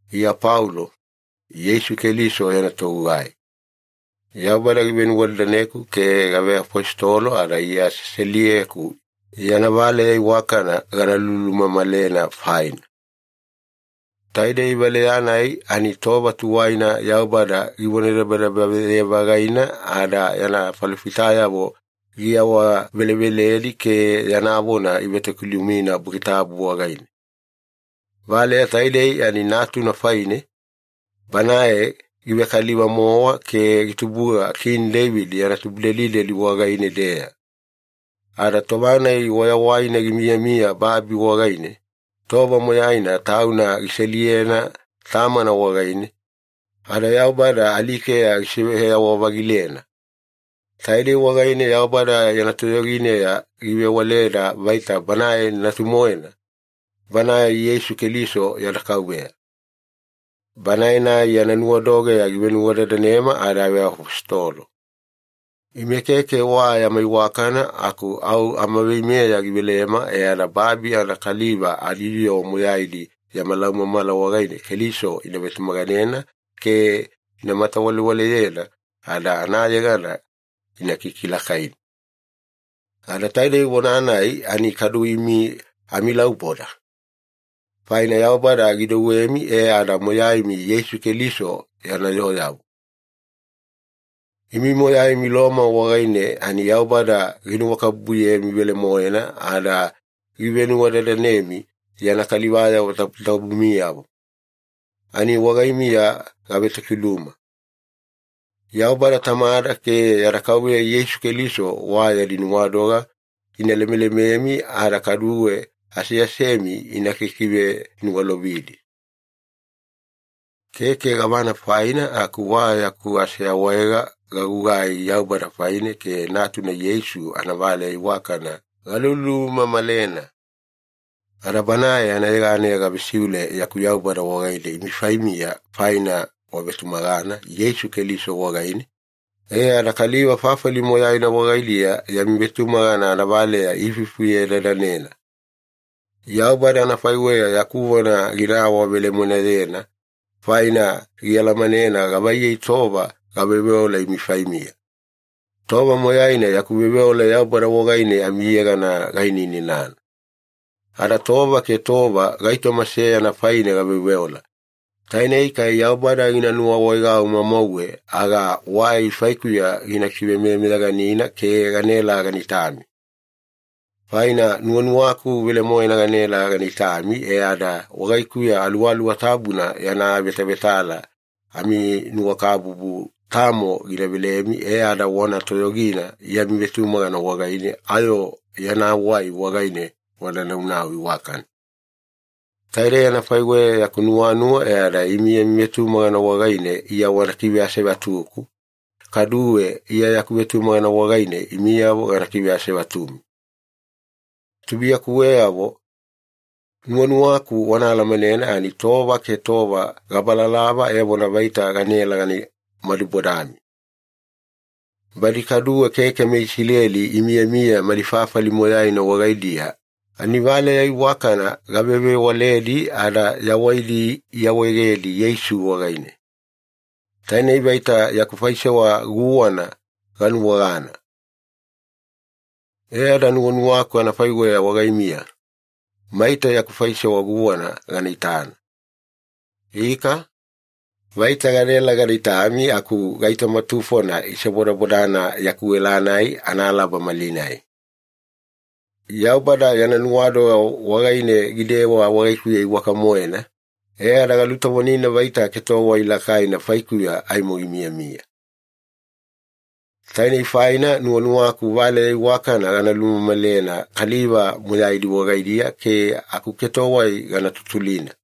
Iya Paulo, Yeisu Keliso yana togugai. Yaubada givenuwadadaneku ke gaveafositolo ada Iya seseliyeku yana valeya iwakana gana lulumamalena faina. Taidei valeya-nai ani tova tuwaina Yaubada givonadabadabaye-vagaina ada yana falofitayavo giawaveleveledi ke yana vona ivetokilumina Buki Tabu wagaine. Valeya taidei ani Natuna faine, Banae givekaliva-mowa ke gitubuga Kini Deivida yana tubudelideli wagaine-deya. Ada tova-nai wayawaina gimiyamiya babi wagaine, tova moyaina Tauna giseliyena Tamana wagaine, ada Yaubada alikeya gisiveyawa-vagilena. Taidei wagaine Yaubada yana toyogineya givewaleda vaita Banae Natu-moena, Banae Yeisu Keliso yada Kauveya. Banae-nai yana nuwadogeya givenuwadadanema ada aveafositolo. Ime keke wa yama iwakana aku au amaveimeya givelema e ada babi anakaliva adiyoo moyaidi yama laumamala wagaine Keliso ina vetumaganena ke ina matawalewaleyena ada anayegana ina kikilakaina. Ada taidei vona-nai ani kadu imi amilauboda. Faina Yaubada gidouwemi e ada moyaimi Yeisu Keliso yana yooyavo. Imi moyaimi Loma wagaine ani Yaubada ginuwakabubuyemi velemoena ada givenuwadadanemi yana kaliva tabutabumiyavo, ani wagaimiya gavetokiluma. Yaubada Tamada ke yada Kauveya Yeisu Keliso wa yadi nuwadoga ina lemelememi ada kaduwe aseasemi ina kikiveniwalovidi. Keke gavana faina aku wa yaku aseawaega gagugai Yaubada faine ke Natuna Yeisu anavaleya iwakana galulumamalena. Ada Banae anayeganeya gavesiule yaku Yaubada wagaine imi faimiya faina wavetumagana Yeisu Keliso wagaine, e ada kaliva fafali moyaina wagaidiya yami vetumagana anavaleya iifuifufuye-dadanena. Yaubada anafaiweya yaku vona gina awavelemoenayena, faina gialamanena gavaiyei tova gaveoveola imi faimiya. Tova moyaina yaku veoveola Yaubada wagaine amiyegana gainanana. Ada tova ke tova gaitoma seyana faine gaveoveola, tainei kai Yaubada gina nuwaawaegau mamauwe aga wai faikuya gina kivemeyameyaganina ke ganaela gana itami. Faina nuwanuwaku velemoena ganaela gana itami, e ada wagaikuya Aluwaluwa Tabuna yana avetavetala aminuwakabubu tamo gina velemi, e ada wana toyogina yami vetumagana wagaine ayo yana wai wagaine wana naunau iwakana. Taidei anafaiweya yaku nuwanuwa e ada imi yami vetumagana wagaine Iya wana kiveasevatuku, kaduwe Iya yaku vetumagana wagaine imiyavo gana kiveasevatumi. Tubuiyakuweyavo, nuwanuwaku wana alamanena ani tova ke tova gabalalava evona vaita ganaela gana madubodami. Badi kaduwe keke meIsileli imiyamiya mali fafali moyaina wagaidiya ani valeya iwakana gavevewaledi ada yawaidi iawaegedi Yeisu wagaine, tainei vaita yaku faisewa guwana ganuwagana. E ada nuwanuwaku anafaiweya wagaimiya, maita yaku faisewa guwana gana itana. Ika, vaita gadaela gada itami aku gaitoma tufona isebodabodana yaku ela-nai analaba malinai. Yaubada yana nuwadoga wagaine gidewa wagaikuya iwaka-moena, e ada galutovonina vaita ketowai lakaina faikuya aimo gimiyamiya. Tainei faina nuwanuwaku valeya iwakana gana lumamalena kaliva moyaidi wagaidiya ke akuketowai gana tutulina.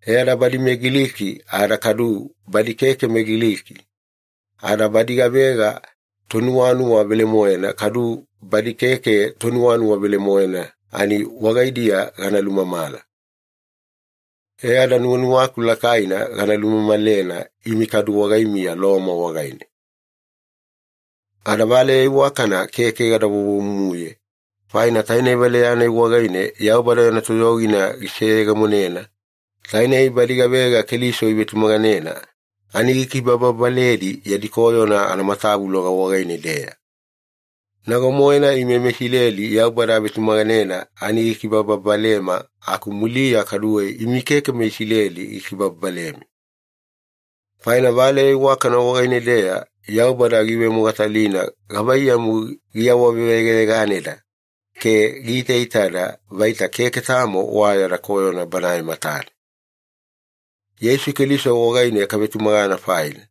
E ada badi meGiliki ada kadu badi keke meGiliki, ada badi gavega tonuwanuwa velemoena kadu badi keke tonuwanuwa velemoena ani wagaidiya gana lumamala. E ada nuwanuwaku lakaina gana lumamalena imi kadu wagaimiya Loma wagaine. Ada valeya iwakana keke gada vovomumuye, faina tainei valeya-nai wagaine Yaubada yana toyogina giseyegemonena, tainei badi gavega Keliso ivetumaganena ani gikibababaledi yadi koyona anamatavuloga wagaine-deya. Nago-moena ime meIsileli Yaubada avetumaganena ani gikibababalema aku muliya kaduwe imi keke meIsileli gikibababalemi. Faina Valeya Iwakana wagaine-deya Yaubada giivemogatalina gavaiyamu giawaveyegayeganeda ke giitaitada vaita keke tamo wa yada koyona Banae matane. Yeisu Keliso wagaine kavetumagana faina,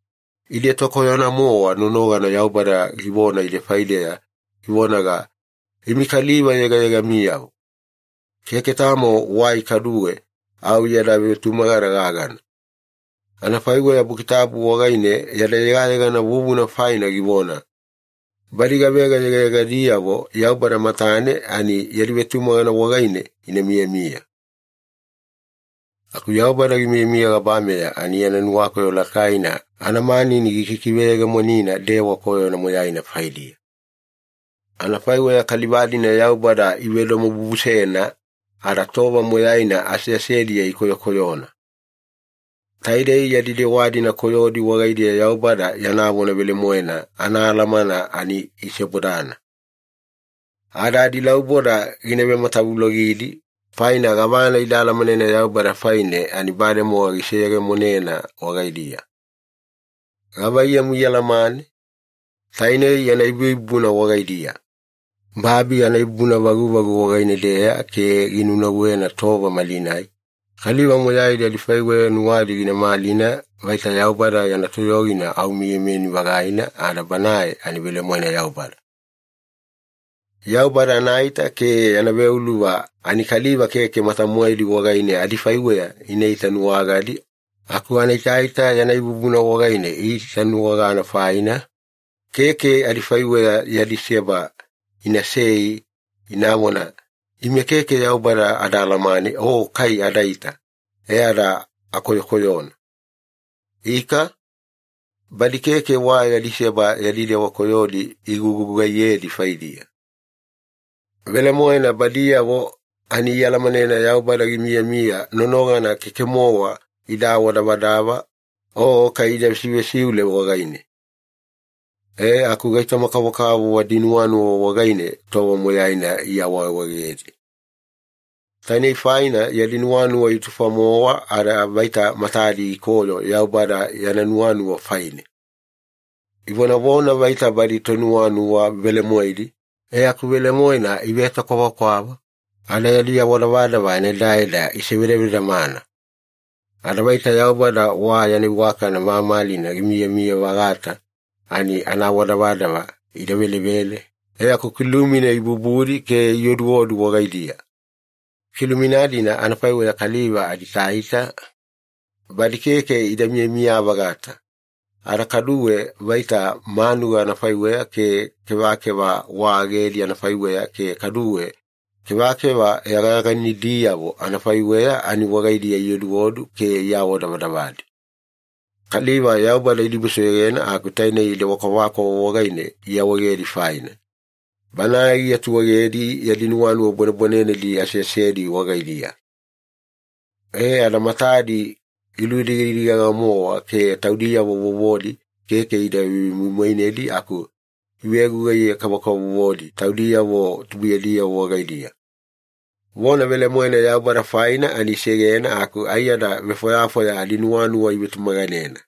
ide tokoyona-mowa nonogana Yaubada givona ide faideya, givonaga, “Imi kaliva yegayegamiyavo.” Keke tamo wai kaduwe, au yada vetumagana gagana. Anafaiweya Buki Tabu wagaine yada yegayegana vuvuna faina givona, “Badi gavega yegayegadiyavo Yaubada matane ani yadi vetumagana wagaine ina miyamiya.” Aku Yaubada gimiyamiya gabameya ani yana nuwakoyo lakaina anamanini gikikiveyegemonina dewa koyona moyaina faidiya. Anafaiweya kaliva-dina Yaubada ivedomobubusena ada tova moyaina aseasediya ikoyokoyona. Taide yadi dewa-dina koyodi wagaidiya Yaubada yana vona velemoena anaalamana ani isebodana. Ada adilauboda gina vematavulogidi, faina gavana ida alamanena Yaubada faine ani bademowa giseyegemonena wagaidiya. Gavaiyamu ialamane? Tainei yana ibuibubuna wagaidiya. Babi anaibuibubuna vaguvagu wagaine-deya ke ginunauwena tova malinai, kaliva moyaidi adifaiweya nuwadi gina malina vaita Yaubada yana toyogina au miyamiyani-vagaina ada Banae ani velemoena Yaubada. Yaubada anaita ke yana veuluva ani kaliva keke mata-moedi wagaine adifaiweya ina itanuwagadi aku anaitaita yana ibubuna wagaine iitanuwagana faina, keke adifaiweya yadi seba inasei inavona, “Ime keke Yaubada ada alamane o kai adaita, e ada akoyokoyona.” Ika, badi keke wa yadi seba yadi dewa koyodi igugugaiyedi faidiya. Velemoena badiyavo ani ialamanena Yaubada gimiyamiya nonogana keke-mowa ida awadavadava o kai ida vesivesiule wagaine. E aku gaitoma-kavokavovo adinuwanuwa wagaine tova moyaina iawaawaegedi. Tainei faina yadi nuwanuwa itufa-mowa ada vaita matadi ikoyo Yaubada yana nuwanuwa faine. Ivonavona vaita badi tonuwanuwa velemoedi, e aku velemoena ivetokwavakwava, ada yadi awadavadava anaedaeda isivedavedamana. Ada vaita Yaubada wa yana iwakana mamalina gimiyamiya-vagata ani anaawadavadava ida velevele e aku kilumina ibubudi ke ioduodu wagaidiya. Kilumina-dina anafaiweya kaliva adiitaita, badi keke ida miyamiya-vagata, ada kaduwe vaita manuga anafaiweya ke kevakeva wa agedi anafaiweya ke kaduwe kevakeva yagayaganidiyavo anafaiweya ani wagaidiya ioduodu ke iawadavadavadi. Kaliva Yaubada idibusoyogena aku tainei dewa kwavakwava wagaine iawaegedi faina, Banae giatuegedi yadi nuwanuwa bwanebwanenedi aseasedi wagaidiya. E ada matadi giludigadigagi-moena ke taudiyavo vovodi keke ida vemoimoinedi aku ivegugaiye-kavokavovodi taudiyavo tubuiyadiyavo wagaidiya. Vona velemoena Yaubada faina ani isegena aku aiyada vefwayafwaya adinuwanuwa ivetumaganena.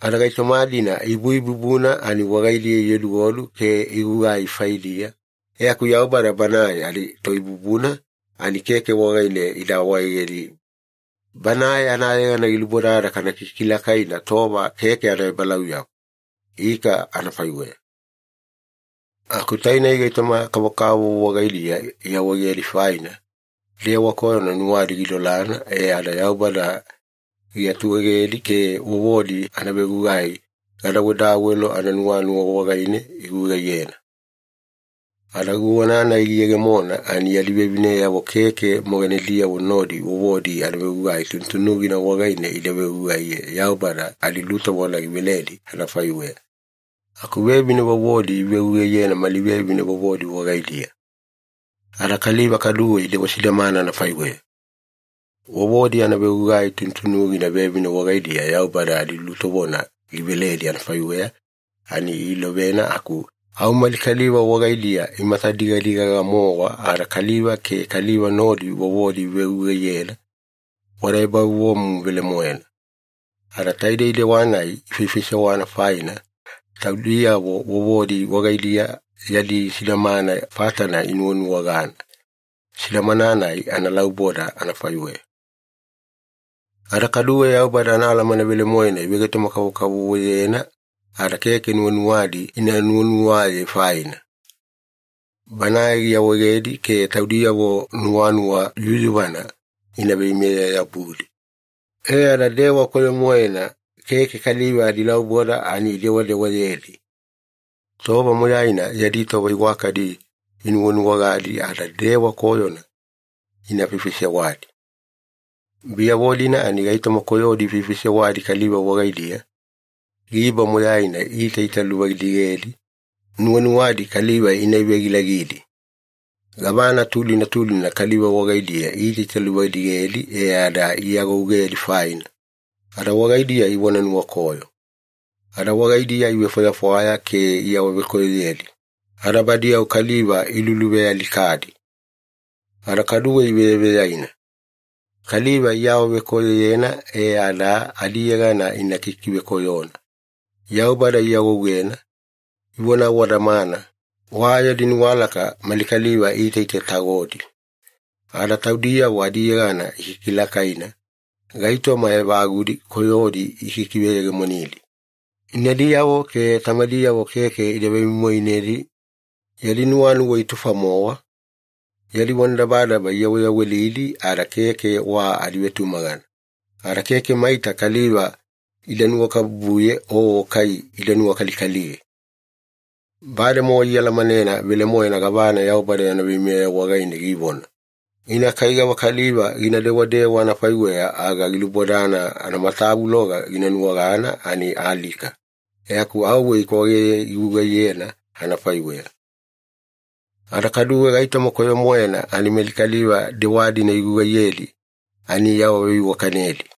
Ada gaitoma-dina ibuibubuna ani wagaidiya ioduodu ke igugai faidiya, e aku Yaubada Banae adiToibubuna ani keke wagaine ida awaegedi, Banae anayegana gilubodada kana kikilakaina tova keke anaebalauyabu. Ika anafaiweya. Aku tainei gaitoma-kavokavovo wagaidiya iawaegedi faina, dewa koyona nuwadi gidolana e ada Yaubada giatuegedi ke vovodi anavegugai gadawedawelo ananuwanuwa wagaine igugaiyena. Ada guwana-nai giyegemona ani yadi vevineyavo keke moganediyavo nodi vovodi anavegugai tunutunugina wagaine ida vegugaiye Yaubada adilutovona giveledi anafaiweya, aku vevine vovodi ivegugaiyena mali vevine vovodi wagaidiya. Ada kaliva kaduwe idewa sidamana anafaiweya. Vovodi anavegugai tunutunugina vevine wagaidiya Yaubada adilutovona giveledi anafaiweya ani iilovena aku au mali kaliva wagaidiya imatadigadigaga-mowa ada kaliva ke kaliva nodi vovodi ivegugaiyena, wada ebavovomumu velemoena. Ada taidei dewa-nai ifaifaisewana faina, taudiyavo vovodi wagaidiya yadi sidamana fatana inuwanuwagana, sidamana-nai analauboda anafaiweya. Ada kaduwe Yaubada anaalamana velemoena ivegaitoma-kavokavovoyena ada keke nuwanuwadi ina nuwanuwaye faina, Banae giawaegedi ke taudiyavo nuwanuwa yuyuvana ina veimeye-yabudi, e ada dewa koyo-moena keke kaliva adilauboda ani idewadewayedi. Tova moyaina yadi tova iwakadi inuwanuwagadi ada dewa koyona ina faifaisewadi. Biyavo-dina ani gaitoma koyodi ifaifaisewadi kaliva wagaidiya, giba moyaina iitaitaluvadigedi, nuwanuwadi kaliva ina ivegilagidi, gavana tulina tulina kaliva wagaidiya iitaitaluvadigedi e ada iagougedi faina, ada wagaidiya ivona nuwakoyo, ada wagaidiya ivefwayafwaya ke iawavekoyoyedi, ada badi au kaliva iluluvealikadi. Ada kaduwe iveyaveyaina, kaliva iawavekoyoyena e ada adiyegana ina kikivekoyona, Yaubada iagougena, ivovona awadamana, wa yadi nuwalaka mali kaliva iitaitatagodi, ada taudiyavo adiyegana ikikilakaina, gaitoma evagudi koyodi ikikiveyegemonidi, inadiyavo ke tamadiyavo keke ida vemoimoinedi, yadi nuwanuwa itufa-mowa, yadi vonadabadaba iyaweyawelidi ada keke wa adivetumagana, ada keke maita kaliva ida nuwakabubuye o kai ida nuwakalikaliye. Bademowa ialamanena velemoena gavana Yaubada yana veimeya wagaine givona, ina kai gavakaliva gina dewadewa anafaiweya aga gilubodana anamatavuloga gina nuwagana ani alika, e aku auwe ikwageye igugugaiyena anafaiweya. Ada kaduwe gaitoma koyo-moena ani mali kaliva dewa-dina igugaiyedi ani iawaveiwakanedi.